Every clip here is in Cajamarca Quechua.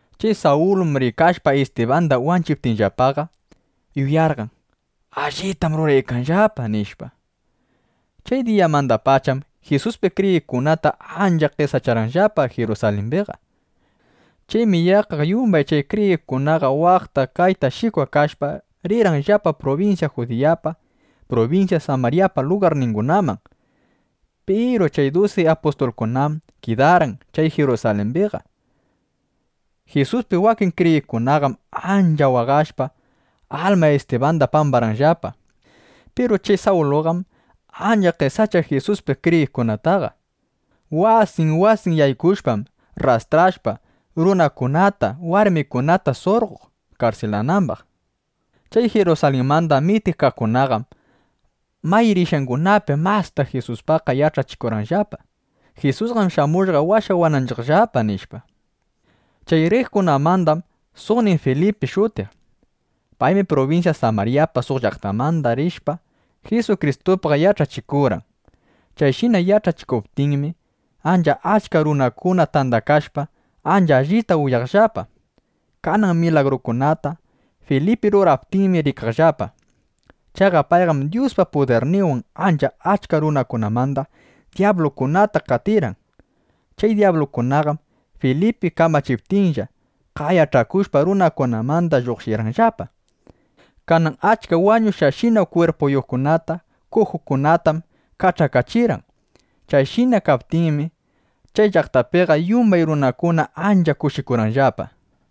Chay Sawlum rikashpa Istibanda wanchiptinllapaqa, yuyarqan: Allitam ruraykanllapa, nishpa. Chay diyamandapacham Jisuspi kriyiqkunata ancha qesacharqanllapa Jirusalimbiqa. Chaymi yaqqa yumbay chay kriyiqkunaqa waqta, kayta shikwakashpa, rirqanllapa prubinsya Judiyapa, prubinsya Samaryapa lugarningunaman. Piru chay dusi apustulkunam kidarqan chay Jirusalimbiqa. Jisuspi wakin kriyiqkunaqam ancha waqashpa, alma Istibanda pambarqanllapa. Piru chay Sawluqam ancha qesachaq Jisuspi kriyiqkunataqa. Wasin wasin yaykushpam, rrastrashpa, runakunata, warmikunata surqoq karsilanambaq. Chay Jirusalinmanda mitikaqkunaqam may rishqangunapi masta Jisuspaqqa yach'achikurqanllapa: —Jisusqam shamushqa washawananchiqllapa, nishpa. Chay riqkunamandam suqnin Filipi shutiq. Paymi prubinsya Samaryapa suq llaqtanman rishpa, Jisukristupaq yach'achikurqan. Chayshina yach'achikuptinmi, ancha achka runakuna tandakashpa, ancha allita uyaqllapa. Kanan milagrukunata Filipi ruraptinmi rikaqllapa. Chaqa payqam Dyuspa pudirninwan ancha achka runakunamanda dyablukunata qatirqan. Chay dyablukunaqam Filipi kamachiptinlla, qayach'akushpa runakunamanda lluqshirqanllapa. Kanan achka wañushqashina kwirpuyuqkunata, kujukunatam kach'akachirqan. Chayshina kaptinmi, chay llaqtapiqa yumbay runakuna ancha kushikurqanllapa.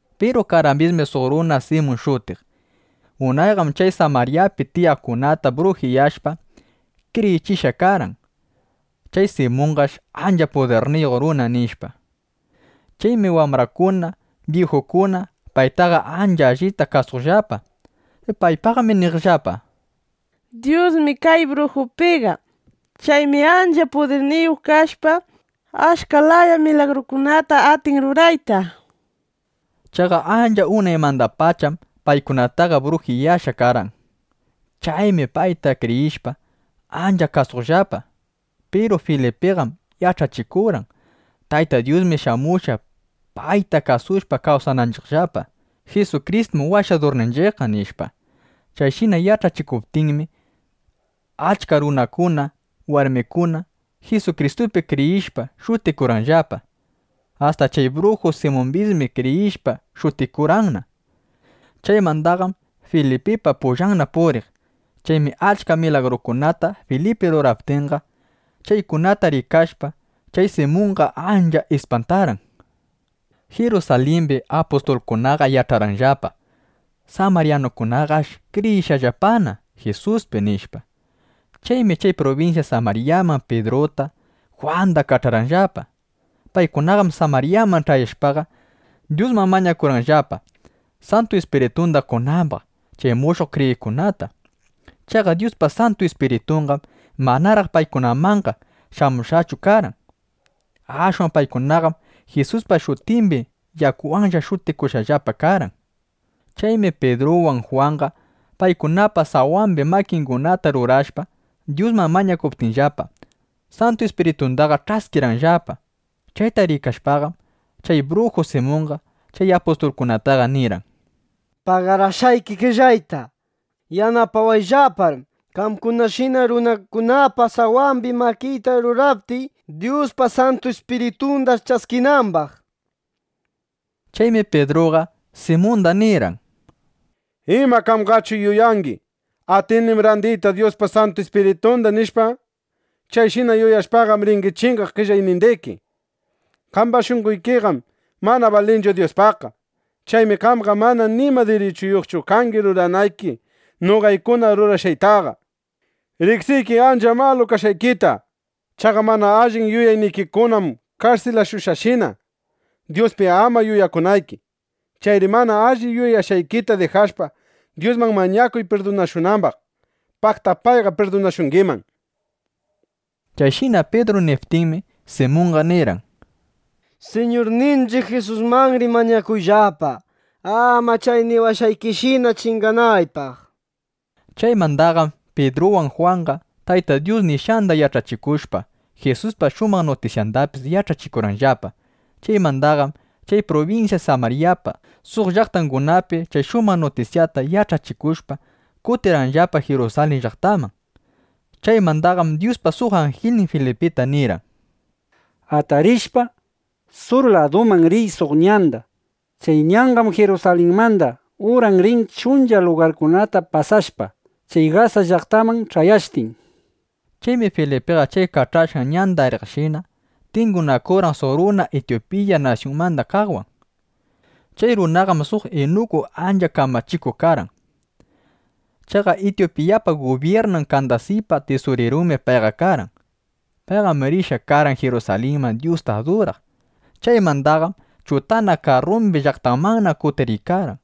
Piru karqambismi suq runa Simun shutiq. Unayqam chay Samaryapi tiyaqkunata brujiyashpa, kriyichishqa karqan: Chay Simunqash ancha pudirniyuq runa, nishpa. Chaymi wambrakuna, byijukuna paytaqa ancha allita kasuqllapa. Paypaqmi niqllapa: —Dyusmi kay brujupiqa. Chaymi ancha pudirniyuq kashpa, achka laya milagrukunata atin rurayta, nishpa. Chaqa ancha unaymandapacham paykunataqa brujiyashqa karqan. Chaymi payta kriyishpa, ancha kasuqllapa. Piru Filipiqam yach'achikurqan: —Tayta Dyusmi shamushqa, payta kasushpa kawsananchiqllapa. Jisukristum Washadurninchiqqa, nishpa. Chayshina yach'achikuptinmi, achka runakuna, warmikuna Jisukristupi kriyishpa shutikurqanllapa. Asta chay bruju Simumbismi kriyishpa shutikurqanna. Chaymandaqam Filipipa pullanna puriq. Chaymi achka milagrukunata Filipi ruraptinqa, chaykunata rikashpa, chay Simunqa ancha ispantarqan. Jirusalimbim apustulkunaqa yach'arqanllapa: Samaryanukunaqash kriyishqallapana Jisuspi, nishpa. Chaymi chay prubinsya Samaryaman Pidruta, Jwanda kach'arqanllapa. Paykunaqam Samaryaman ch'ayashpaqa, Dyusman mañakurqanllapa, Santu Ispiritunda qonambaq chay mushuq kriyiqkunata. Chaqa Dyuspa Santu Ispiritunqam manaraq paykunamanqa shamushqachu karqan. Ashwan paykunaqam Jisuspa shutimbi yakuwanlla shutikushqallapa karqan. Chaymi Pidruwan Jwanqa paykunapa sawambi makingunata rurashpa, Dyusman mañakuptinllapa, Santu Ispiritundaqa ch'askirqanllapa. Chayta rikashpaqam, chay bruju Simunqa chay apustulkunataqa nirqan: —Pagarashqayki qellayta. Yanapawayllapar qamkunashina runakunapa sawambi makiyta ruraptiy, Dyuspa Santu Ispiritunda ch'askinambaq, nishpa. Chaymi Pidruqa, Simunda nirqan: —¿Ima qamqachu yuyangi: Atinim randiyta Dyuspa Santu Ispiritunda, nishpa? Chayshina yuyashpaqam, ringi chingaq qellaynindiki. Qamba shunqoykiqam mana balinchu Dyuspaqqa. Chaymi qamqa mana nima dirichuyuqchu kangi ruranayki noqaykuna rurashqaytaqa. Riqsiykim ancha malu kashqaykita. Chaqa mana allin yuyaynikikunam karsilashushqashina, Dyuspi ama yuyakunayki. Chayri mana alli yuyashqaykita dijashpa, Dyusman mañakuy pirdunashunambaq. Paqta payqa pirdunashungiman, nishpa. Chayshina Pidru niptinmi, Simunqa nirqan: —Siñurninchiq Jisusmanri mañakuyllapa, ama chay niwashqaykishina chinganaypaq, nishpa. Chaymandaqam Pidruwan Jwanqa Tayta Dyus nishqanda yach'achikushpa, Jisuspa shumaq nutisyandapis yach'achikurqanllapa. Chaymandaqam chay prubinsya Samaryapa suq llaqtangunapi chay shumaq nutisyata yach'achikushpa, kutirqanllapa Jirusalin llaqtaman. Chaymandaqam Dyuspa suq anjilnin Filipita nirqan: —Atarishpa, sur laduman riy suq ñanda. Chay ñanqam Jirusalinmanda uran rin chuncha lugarkunata pasashpa, chay Gasa llaqtaman ch'ayashtin, nishpa. Chaymi Filipiqa chay kach'ashqan ñanda riqshina, tingunakurqan suq runa Ityupiya nasyunmanda kaqwan. Chay runaqam suq inuku ancha kamachikuq karqan. Chaqa Ityupiyapa gubyirnan Kandasipa tisurirunmi payqa karqan. Payqam rishqa karqan Jirusalinman Dyusta aduraq. Chaymandaqam chutana karrumbi llaqtanmanna kutiriykarqan.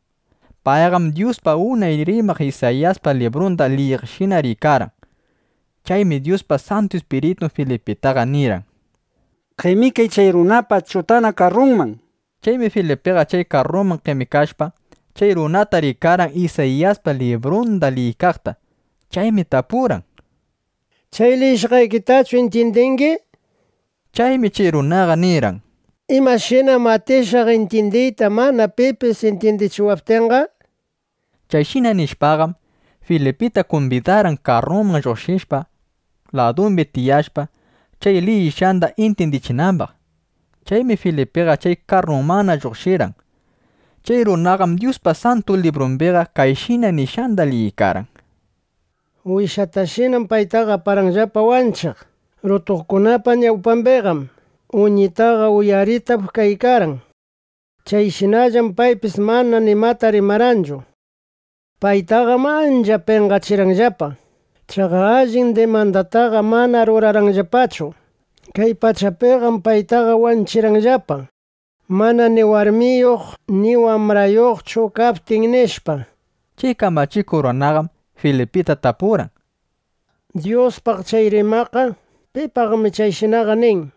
Payqam Dyuspaq unay rimaq Isayiyaspa librunda liyiqshina riykarqan. Chaymi Dyuspa Santu Ispiritun Filipitaqa nirqan: —Qemikay chay runapa chutana karrunman, nishpa. Chaymi Filipiqa chay karruman qemikashpa, chay runata rikarqan Isayiyaspa librunda liyiykaqta. Chaymi tapurqan: —¿Chay liyishqaykitachu intyindingi? nishpa. Chaymi chay runaqa nirqan: —¿Imashinam atishaq intyindiyta, mana pipis intyindichiwaptinqa? nishpa. Chayshina nishpaqam, Filipita kumbidarqan, karrunman lluqshishpa, ladumbi tiyashpa, chay liyishqanda intyindichinambaq. (Chaymi Filipiqa chay karrumanna lluqshirqan.) Chay runaqam Dyuspa Santu Librumbiqa kayshina nishqanda liyiykarqan: Wishatashinam paytaqa aparqanllapa wanchiq. Rutuqkunapa ñawpambiqam uñitaqa uyaritap kaykarqan. Chayshinallam paypis mana nimata rimarqanchu. Paytaqam ancha penqachirqanllapa. Chaqa allin dimandataqa manam rurarqanllapachu. Kay pachapiqam paytaqa wanchirqanllapa, mana ni warmiyuq ni wambrayuqchu kaptin, nishpa. Chay kamachikuq runaqam Filipita tapurqan: —Dyuspaq chay rimaqqa ¿pipaqmi chayshinaqa nin?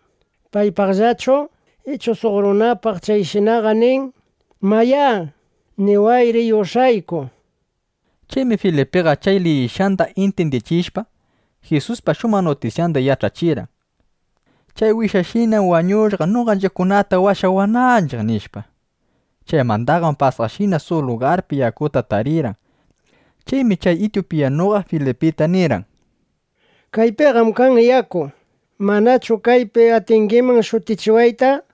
¿Paypaqllachu ichu suq runapaq chayshinaqa nin? Mayá, niwayri yush'ayku, nishpa. Chaymi Filipiqa chay liyishqanda intyindichishpa, Jisuspa shumaq nutisyanda yach'achirqan: (“Chay wishashinam wañushqa, noqanchiqkunata washawananchiq”, nishpa). Chaymandaqam pasaqshina suq lugarpi yakuta tarirqan. Chaymi chay ityupiyanuqa Filipita nirqan: —Kaypiqam kan yaku. ¿Manachu kaypi atingiman shutichiwayta? nishpa. ˻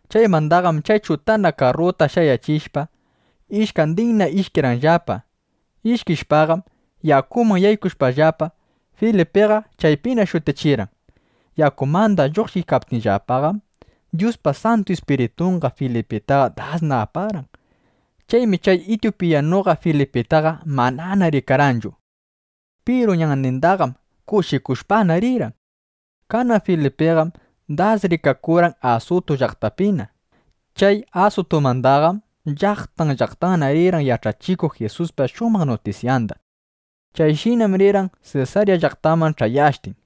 Chaymandaqam chay chutana karruta shayachishpa, ishkandinna ishkirqanllapa. Ishkishpaqam yakuman yaykushpallapa Filipiqa chaypina shutichirqan. Yakumanda lluqshiptinllapaqam, Dyuspa Santu Ispiritunqa Filipitaqa dasna aparqan. Chaymi chay ityupiyanuqa Filipitaqa manana rikarqanchu. Piru ñannindaqam kushikushpana rirqan. Kanan Filipiqam das rikakurqan Asutu llaqtapina. Chay Asutumandaqam llaqtan llaqtanna rirqan yach'achikuq Jisuspa shumaq nutisyanda. Chayshinam rirqan Sesarya llaqtaman ch'ayashtin.